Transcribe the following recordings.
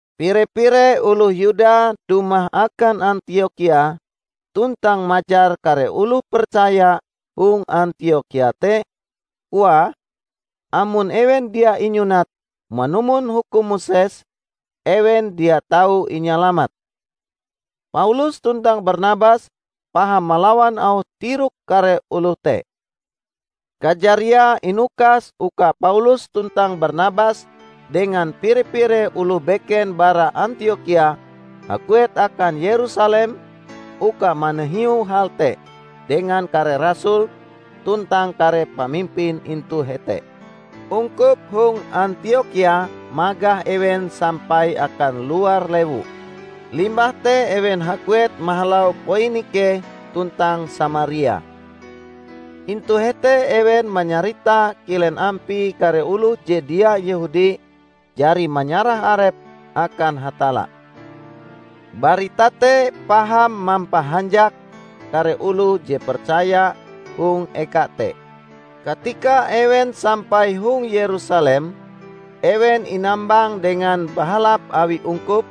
Pire-pire oloh Yuda dumah akan Antiokhia tuntang majar kare oloh percaya hong Antiokhia te, koae, amon ewen dia inyunat manumon hukum Moses, ewen dia tau inyalamat. Paulus tuntang Barnabas paham malawan auh tirok kare oloh te. Kajariae inukas uka Paulus tuntang Barnabas dengan pire-pire oloh beken bara Antiokhia haguet akan Yerusalem uka manahiu hal te dengan kare rasul tuntang kare pamimpin intu hete. Ungkup hong Antiokhia magah ewen sampai akan luar lewu, limbah te ewen haguet mahalau Poinike tuntang Samaria. Intu hete ewen manyarita kilen ampie kare oloh je dia Yehudi jari manyarah arepe akan Hatalla. Barita te paham mampahanjak kare oloh je percaya hong eka te. Katika ewen sampai hong Yerusalem, ewen inambang dengan bahalap awi ungkup,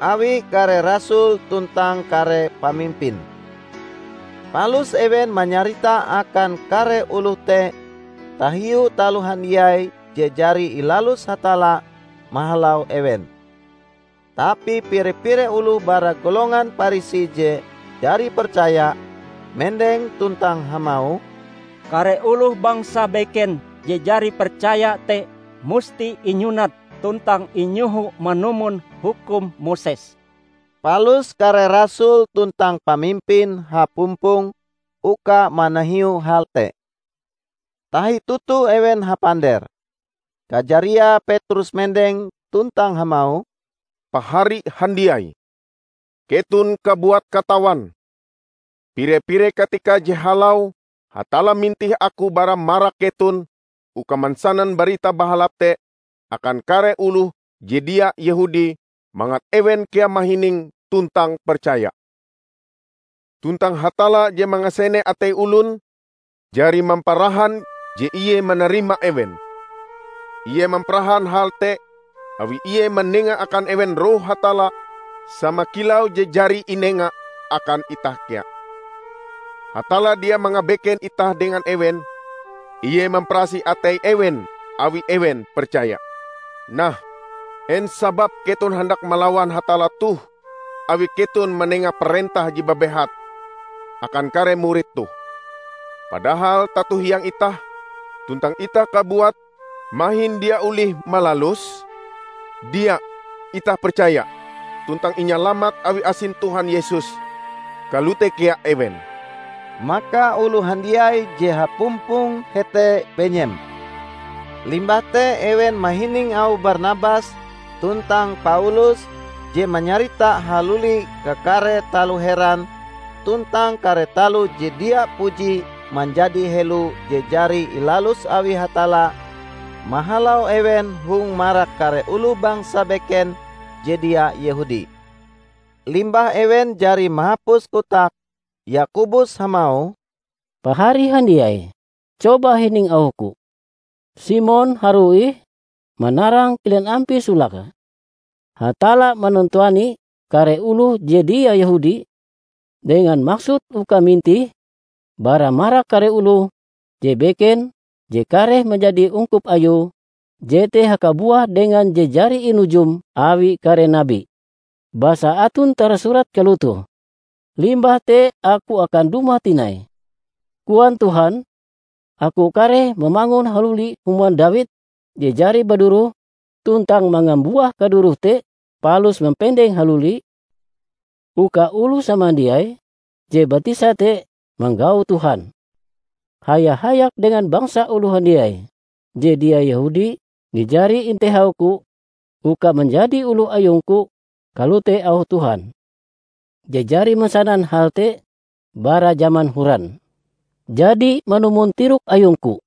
awi kare rasul tuntang kare pamimpin. Palus ewen manyarita akan kare oloh te tahiu taloh handiai je jari ilalus Hatalla mahalau ewen. Tapi pire-pire oloh bara golongan Parisi je jari percaya, mendeng tuntang hamauh, "Kare oloh bangsa beken je jari percaya te musti inyunat tuntang inyoho manumon hukum Moses." Palus kare rasul tuntang pamimpin hapumpong uka manahiu hal te. Tahi toto ewen hapander. Kajariae Petrus mendeng tuntang hamauh, "Pahari handiai! Keton kabuat katawan, pire-pire katika je halau Hatalla mintih aku bara marak keton uka mansanan Barita Bahalap te akan kare oloh je dia Yehudi mangat ewen kea mahining tuntang percaya. Tuntang Hatalla je mangasene atei olon jari mamparahan je ie manarima ewen; Ie mamparahan hal te awi Ie manenga akan ewen Roh Hatalla sama kilau je jari inenga akan itah kea. Hatalla dia mangabeken itah dengan ewen. Ie mamparasih atei ewen, awi ewen percaya. Nah, en sababe keton handak malawan Hatalla toh awi keton manenga parentah je babehat akan kare murid toh, padahal tato-hiang itah tuntang itah kabuat mahin dia olih malaluse? Dia! Itah percaya tuntang inyalamat awi asin Tuhan Yesus; kalote kea ewen." Maka oloh handiai je hapumpong hete benyem. Limbah te ewen mahining auh Barnabas tuntang Paulus je manyarita haluli kakare taloh heran tuntang kare taloh je dia puji manjadi helo je jari ilalus awi Hatalla mahalau ewen hong marak kare oloh bangsa beken je dia Yehudi. Limbah ewen jari mahapus kotake, Yakobus hamauh, "Pahari handiai! Coba hining auhku. Simon harue ih manarang kilen ampie solake Hatalla manantuani kare oloh je dia Yehudi, dengan maksud uka mintih bara marak kare oloh je beken je kareh manjadi ungkup Ayue, jete hakabuah dengan je jari inujum awi kare nabi. Basa aton tarasurat kalotoh, 'Limbah te Aku akan dumah tinai,' koan Tuhan, 'Aku kareh mamangun haluli human Dawid je jari baduroh, tuntang mangambuah kadurohe te, palus mampendenge haluli; uka oloh samandiai je batisa te manggau Tuhan, haya-hayak dengan bangsa oloh handiai je dia Yehudi je jari intehau-Ku uka manjadi oloh ayung-Ku.' Kalote auh Tuhan, je jari mansanan hal te bara jaman horan." "Jadi manumon tirok ayungku,"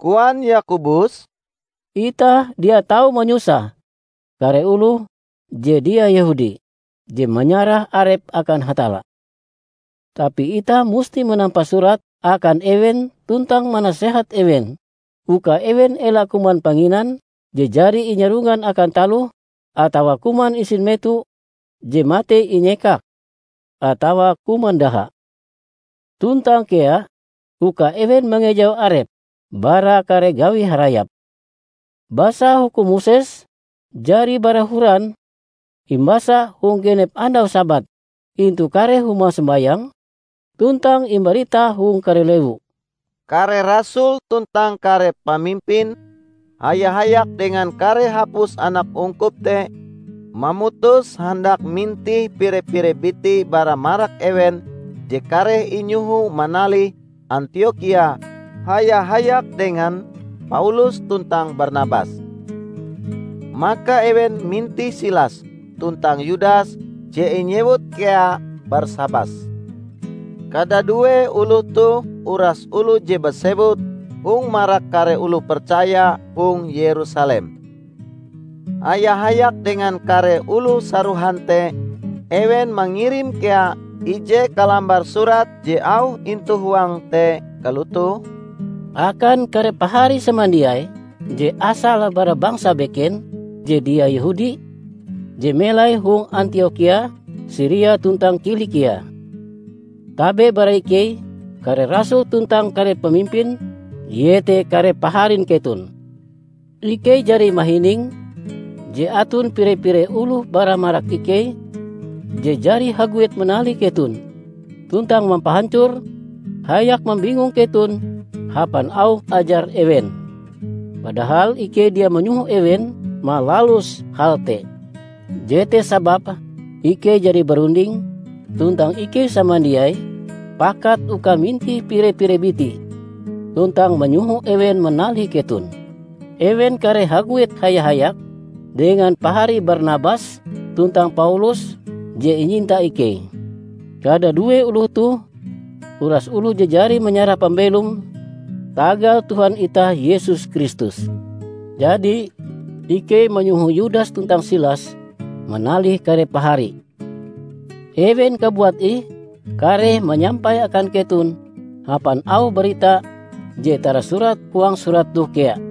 koan Yakobus, "itah dia tau manyusah kare oloh je dia Yehudi je manyarah arepe akan Hatalla. Tapi itah musti manampa surat akan ewen tuntang manasehat ewen uka ewen ela kuman panginan je jari inyarongan akan taloh, atawa kuman isin meto je matei inyekak, atawa kuman daha. Tuntang kea uka ewen mangejau arepe bara kare gawi harayap. Basa hukum Moses jari bara horan imbasa hong genep andau Sabat intu kare huma sombayang, tuntang imbarita hong kare lewu." Kare rasul tuntang kare pamimpin, haya-hayak dengan kare hapus anak ungkup te mamutus handak mintih pire-pire biti bara marak ewen je kareh inyoho manalih Antiokhia haya-hayak dengan Paulus tuntang Barnabas. Maka ewen mintih Silas tuntang Yudas je inyewut kea Barsabas. Kadadue oloh toh uras oloh je basewut hong marak kare oloh percaya hong Yerusalem. Haya-hayak dengan kare oloh sarohan te ewen mangirim kea ije kalambar surat je auh intu huange te kalotoh, "Akan kare pahari samandiai je asale bara bangsa beken je dia Yehudi, je melai hong Antiokhia, Siria tuntang Kilikia. Tabe bara ikei, kare rasul tuntang kare pamimpin, iete kare paharin keton. Ikei jari mahining je aton pire-pire oloh bara marak ikei je jari haguet manalih keton tuntang mampahancor hayak mambingung keton hapan auh ajar ewen. Padahal ikei dia manyoho ewen malalus hal te. Jete sababe ikei jari barunding tuntang ikei samandiai pakat uka mintih pire-pire biti tuntang manyoho ewen manalih keton. Ewen kareh haguet haya-hayak dengan pahari Barnabas tuntang Paulus je inyinta ikei. Kadadue oloh toh uras oloh je jari mayarah pambelome tagal Tuhan itah Yesus Kristus. Jadi, ikei manyoho Yudas tuntang Silas manalih kare pahari. Ewen kabuat ih kareh manyampai akan keton hapan auh barita je tarasurat huang surat toh kea.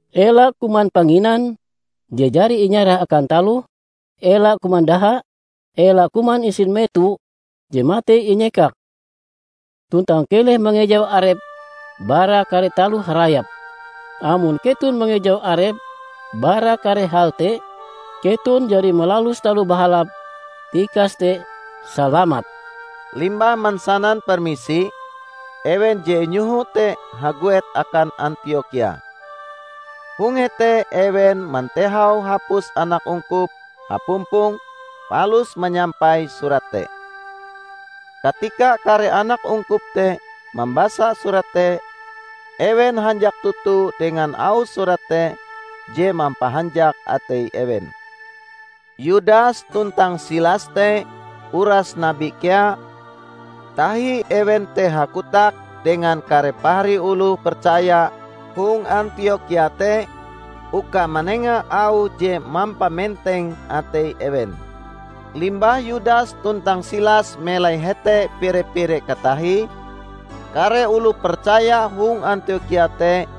ela kuman panginan je jari inyarah akan taloh; ela kuman daha, ela kuman isin meto je matei inyekak, tuntang keleh mangejau arep bara kare taloh harayap. Amon keton mangejau arep bara kare hal te, keton jari malalus taloh bahalap. Tikas te, salamat!" Limbah mansanan permisi, ewen je inyoho te haguet akan Antiokhia. Hong hete ewen mantehau hapus anak ungkup hapumpong palus manyampai surat te. Katika kare anak ungkup te mambasa surat te, ewen hanjak toto dengan auh surat te je mampahanjak atei ewen. Yudas tuntang Silas te uras nabi kea, tahi ewen te hakotak dengan kare pahari oloh percaya hong Antiokhia te uka manenga auh je mampamenteng atei ewen. Limbah Yudas tuntang Silas melai hete pire-pire katahie, kare oloh percaya hong Antiokhia te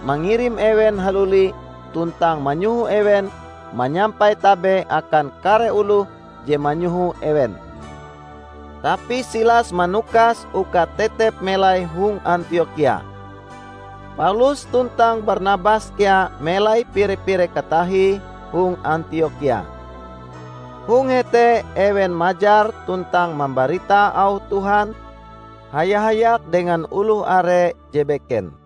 mangirim ewen haluli tuntang manyoho ewen manyampai tabe akan kare oloh je manyoho ewen. [ Tapi Silas manukas uka tetep melai hong Antiokhia.] Paulus tuntang Barnabas kea melai pire-pire katahie hong Antiokhia. Hong hete ewen majar tuntang mambarita auh Tuhan haya-hayak dengan oloh are je beken.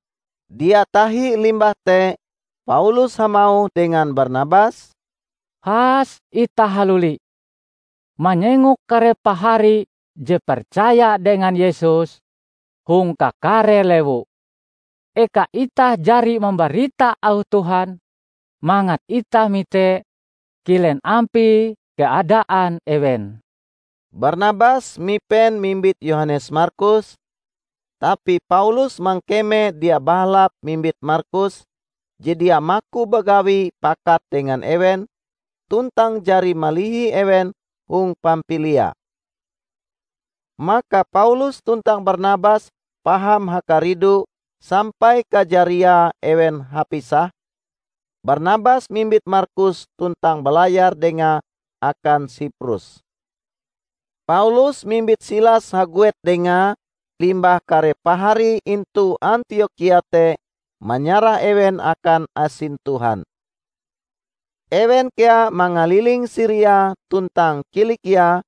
Dia tahi limbah te Paulus hamauh dengan Barnabas, "Has itah haluli manyengok kare pahari je percaya dengan Yesus hong kakare lewu eka itah jari mambarita auh Tuhan; mangat itah mite kilen ampie kaadaan ewen." Barnabas mipen mimbit Yohanes Markus, tapi Paulus mangkeme dia bahalap mimbit Markus, je dia maku bagawi pakat dengan ewen tuntang jari malihi ewen hong Pampilia. Maka Paulus tuntang Barnabas paham hakaridu sampai kajariae ewen hapisah: Barnabas mimbit Markus tuntang balayar dengae akan Siprus. Paulus mimbit Silas haguet dengae limbah kare pahari intu Antiokhia te manyarah ewen akan asin Tuhan. Ewen kea mangaliling Siria tuntang Kilikia;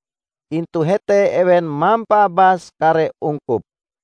intu hete ewen mampaabas kare ungkup.